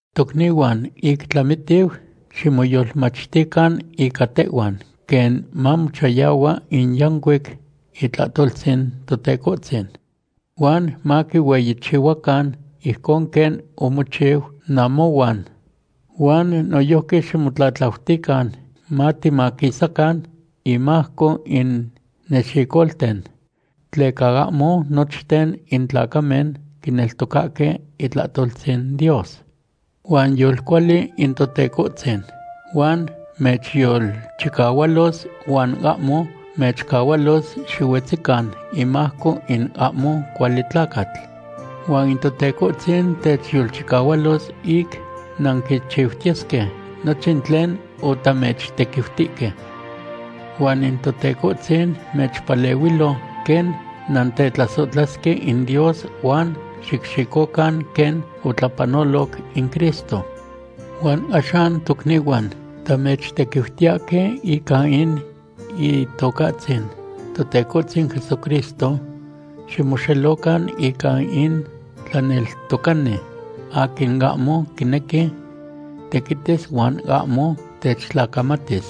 Tocnihuan, ic tlamitiu, ximoyolmachtican ica tehhuan quen mamochayahua in yancuic itlahtoltzin Totecohtzin. Huan maquihueyichihuacan ijcon quen omochiu namohuan. Huan noyojqui ximotlatlautican matimaquisacan inmajco in nexicolten. Tleca ahmo nochten in tlacamen quineltocahque itlahtoltzin Dios. Huan yolcuali in Totecohtzin, huan mechyolchicahualos huan ahmo mechcahualos xihuetzican imajco in ahmo cuali tlacatl. Huan in Totecohtzin techyolchicahualos ic nanquichiutiyesque nochin tlen otamechtequiutihque. Huan in Totecohtzin mamechpalehuilo quen nantetlasohtlasque in Dios huan xicxicocan quen otlapanoloc in Cristo. Huan axan tocnihuan, tamechtequiutiyahque ica in Itocahtzin Totecohtzin Jesucristo, ximoxelocan ica in tlaneltocani aquin ahmo quinequi tequitis huan ahmo techtlacamatis.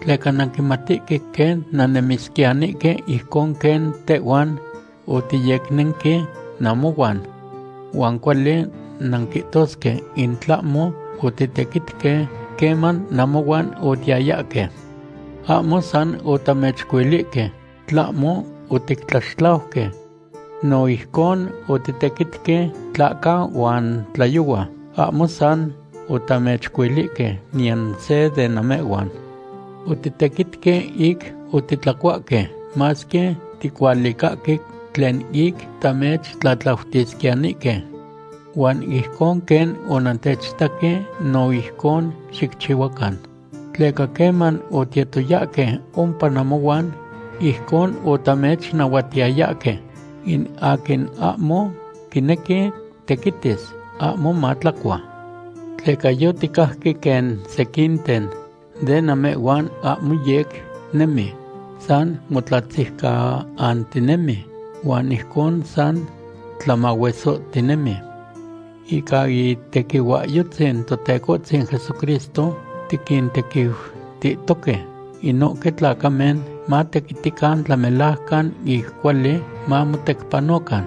Tleca nanquimatihque quen nannemisquiyanihque ijcon quen tehhuan otiyecnenque namohuan. Huan cuali nanquihtosque in tlahmo otitequitque queman namohuan otiyayahque. Ahmo san otamechcuilihque; tlahmo otictlaxtlauque. No ijcon otitequitque tlahca huan tlayohua ahmo san otamechcuilihque niyan se de namehhuan. Otitequitque ic otitlacuahque, masque ticualicahque tlen ic tamechtlatlautisquiyanihque. Huan ijcon quen onantechitaque, no ijcon xicchihuacan. Tleca queman otiyetoyahque ompa namohuan, ijcon otamechnahuatiyayahque; in aquin ahmo quinequi tequitis, ahmo matlacua. Tleca yoticajque quen sequinten de namehhuan ahmo yec nemi; san motlatziucahantinemi huan ijcon san tlamahuesohtinemi. Ica itequihuahyotzin Totecohtzin Jesucristo tiquintequiutihtohque inohque tlacamen matequitican tlamelajcan ic cuali mamotecpanocan.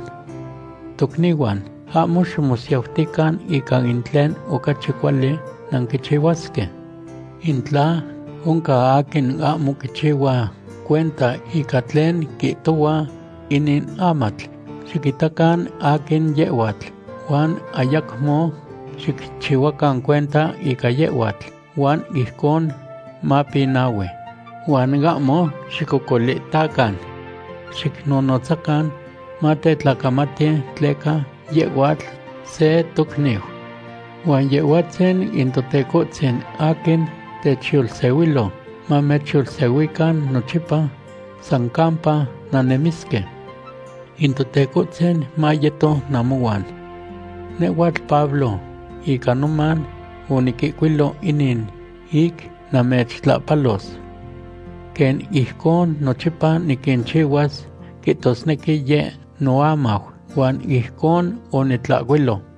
Tocnihuan, ahmo ximosiautican ica in tlen ocachi cuali nanquichihuasque. In tla oncan aquin ahmo quichihua cuenta ica tlen quihtohuas inin amatl, xiquitacan aquin yehhuatl, huan ayacmo xicchihuacan cuenta ica yehhuatl, huan ijcon mapinahui. Huan ahmo xicocolitacan. Xicnonotzacan matetlacamati, tleca yehhuatl se tocniu. Huan Yehhuatzin in Totecohtzin aquin teyolsehuiya mamechyolsehuican nochipa san campa nannemisque. In Totecohtzin mayeto namohuan. Nehhuatl Pablo, ica noman oniquihcuilo inin ic namechtlahpalos. Quen ijcon nochipa niquinchihuas, quihtosnequi yeh noamau, huan ijcon onitlahcuilo.